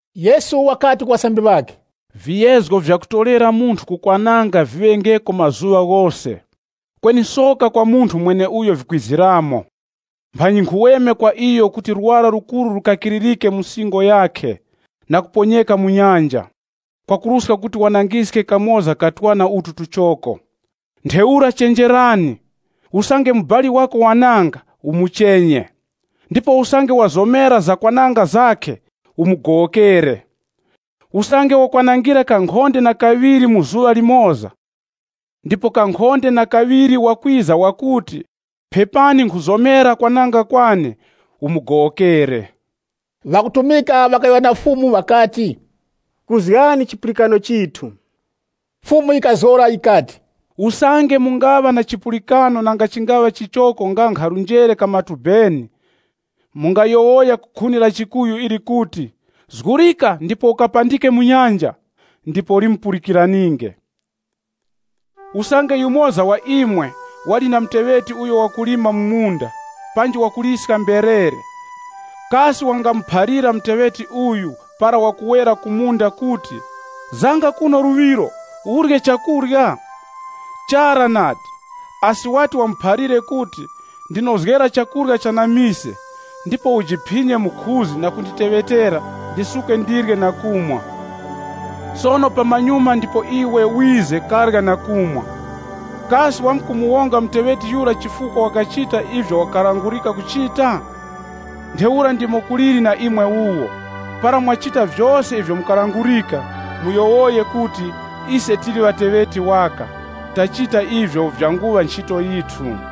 Yesu wakati ku ŵasambiri ŵakhe, Viyezgo vyakutorera munthu ku kwananga viŵengeko mazuŵa ghose, kweni soka kwa munthu mweneuyo vikwiziramo! Mphanyi nkhuweme kwa iyo kuti lwara lukuru lukakiririke mu singo yakhe, na kuponyeka mu nyanja, kwakuruska kuti wanangiske kamoza ka twana utu tuchoko. Ntheura chenjerani! “Usange mubali wako wananga, umuchenye. Ndipo usange wazomera zakwananga zakhe, umugowokere. Usange wakwanangira kankhonde na kaŵiri mu zuŵa limoza, ndipo kankhonde na kaŵiri wakwiza wakuti, ‘Phepani nkhuzomera kwananga kwane,’ umugowokere.” Ŵakutumika ŵakayowoya na Fumu ŵakati, “Kuzgani chipulikano chithu.” Fumu yikazgora yikati, “Usange mungaŵa na chipulikano nanga chingaŵa chichoko nga nkha njere ka matubeni, mungayowoya ku khuni la chikuyu ili kuti, ‘Zgurika ndipo ukapandike mu nyanja!’, ndipo limupulikiraninge.” “Usange yumoza wa imwe, wali na muteŵeti uyo wakulima mu munda, panji wakuliska mberere, kasi wangamuphalira muteŵeti uyu para wakuwera ku munda kuti, ‘Zanga kuno luŵiro, urye chakurya?’ Chara nadi, asi wati wamuphalire kuti, ‘Ndinozgera chakurya cha na mise ndipo ujiphinye mukhuzi na kunditeŵetera ndisuke ndirye na kumwa. Sono pamanyuma ndipo iwe wize karye na kumwa.’ Kasi wakumuwonga muteŵeti yura chifukwa wakachita ivyo wakalangulika kuchita? Ntheura ndimo kuliri na imwe wuwo, para mwachita vyose ivyo mukalangurika, muyowoyenge kuti, ‘Ise tili ŵateŵeti waka. Tachita ivyo vyanguŵa nchito yithu.’”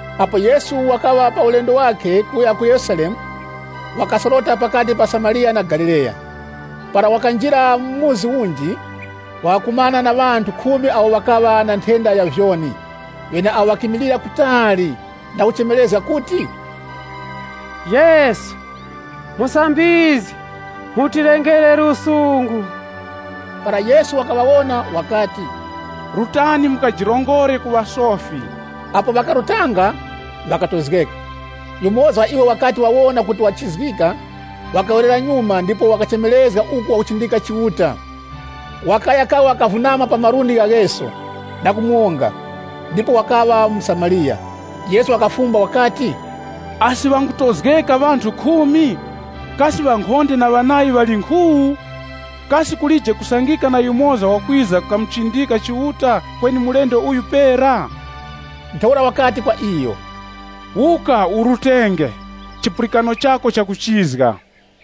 Apo Yesu wakaŵa pa ulendo wakhe kuya ku Yerusalemu, wakasorota pakati pa Samariya na Galileya. Para wakanjira mu chikaya chinji, wakakumana na ŵanthu khumi awo ŵakaŵa na nthenda ya vyoni, ŵeneawo ŵakimilira kutali, na kuchemerezga kuti, “Yesu! Musambizgi! Mutilengere lusungu.” Para Yesu wakaŵawona wakati, “Rutani mukajirongore ku ŵasofi.” Apo ŵakarutanga, ŵakatozgeka. Yumoza wa iwo wakati wawona kuti wachizgika, wakawerera nyuma ndipo wakachemerezga uku wakuchindika Chiuta. Wakaya kawa kavunama pa malundi gha Yesu na kumuwonga. Ndipo wakaŵa mu Samariya. Yesu wakafumba wakati, “Asi ŵangutozgeka ŵanthu khumi? Kasi ŵankhonde na ŵanayi ŵali nkhu? Kasi kulije kusangika na yumoza wakwiza kamuchindika Chiuta, kweni mulendo uyo pera?” Ntheura wakati kwa iyo, “Wuka, urutenge, chipulikano chako chakuchizga.”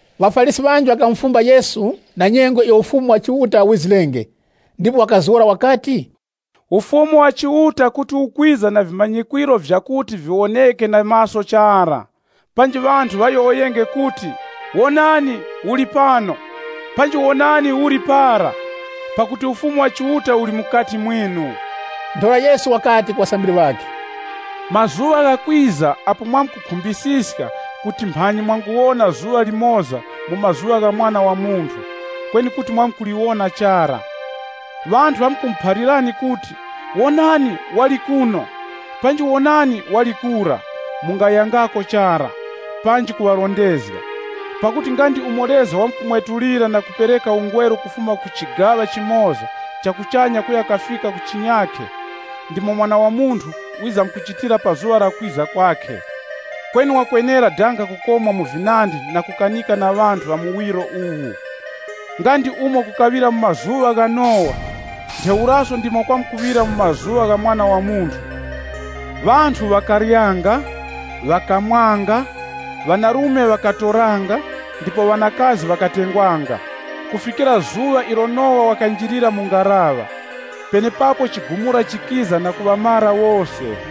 ŴaFarisi ŵanji ŵakamufumba Yesu na nyengo iyo Ufumu wa Chiuta wizirenge, ndipo wakazgora wakati, “Ufumu wa Chiuta kuti ukwiza na vimanyikwiro vyakuti viwoneke na maso chara. Panji ŵanthu ŵayowoyenge kuti, ‘Wonani, uli pano, panji wonani, uli para,’ pakuti Ufumu wa Chiuta uli mukati mwinu.” Ntheura Yesu wakati ku ŵasambiri ŵakhe, “Mazuŵa ghakwiza apo mwamkukhumbisiska kuti mphanyi mwanguwona zuŵa limoza mu mazuŵa gha Mwana wa Munthu, kweni kuti mwamkuliwona chara. Ŵanthu ŵamkumuphalirani kuti, ‘Wonani, wali kuno, panji wonani, wali kura!’, mungayangako chara, panji kuŵarondezga. Pakuti nga ndi umo leza wakumwetukira na kupereka ungweru kufuma ku chigaŵa chimoza cha kuchanya kuya ku chinyakhe, ndimo Mwana wa Munthu wizamkuchitira pa zuŵa la kwiza kwakhe. Kweni wakwenera danga kukomwa mu vinandi na kukanika na ŵanthu ŵa muwiro uwu. Nga ndi umo kukaŵira mu mazuŵa gha Nowa, ntheuraso ndimo kwamkuŵira mu mazuŵa gha Mwana wa Munthu. Ŵanthu ŵakaryanga, ŵakamwanga, ŵanarume ŵakatoranga, ndipo ŵanakazi ŵakatengwanga, kufikira zuŵa ilo Nowa wakanjirira mu ngaraŵa. Penepapo chigumura chikiza na kuŵamara wose.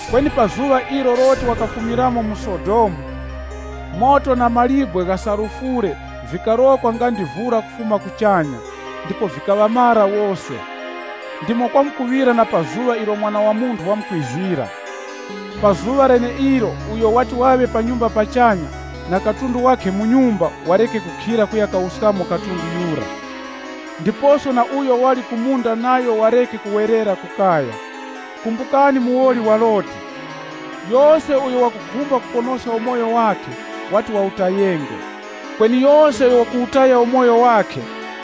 Kweni pa zuŵa ilo Loti wakafumiramo mu Sodomu, moto na mawe gha sulufure vikarokwa nga ndi vura kufuma kuchanya, ndipo vikaŵamara wose. Ndimo kwamkuŵira na pa zuŵa ilo Mwana wa Munthu wamkwizira. “Pa zuŵa leneilo uyo wati waŵe pa nyumba pachanya, na katundu wakhe mu nyumba wareke kukhira kuya kawuskamo katundu yura. Ndiposo na uyo wali ku munda nayo wareke kuwerera ku kaya. Kumbukani muwoli wa Loti! Yose uyo wakukhumba kuponoska umoyo wakhe, wati wawutayenge. Kweni yose uyo wakuwutaya umoyo wakhe,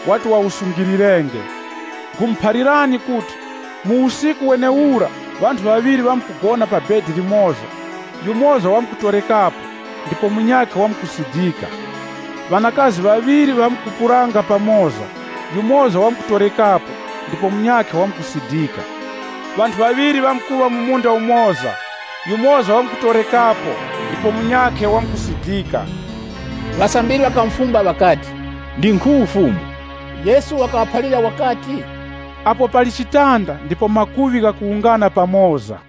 wati wawusungilirenge. Nkhumuphalirani kuti, mu usiku wenewura ŵanthu ŵaŵiri ŵamkugona pa chitara chimoza, yumoza wamkutorekapo, ndipo munyakhe wamkusidika. Ŵanakazi ŵaŵiri ŵamkupulanga pamoza, yumoza wamkutorekapo, ndipo munyakhe wamkusidika.” [ Ŵanthu ŵaŵiri ŵamkuŵa mu munda umoza, yumoza wamkutorekapo ndipo munyakhe wamkusidika.] Ŵasambiri ŵakamufumba ŵakati, “Ndi nkhu, Fumu?” Yesu wakaŵaphalira wakati, “Apo pali chitanda, ndipo makuŵi ghakuwungana pamoza.”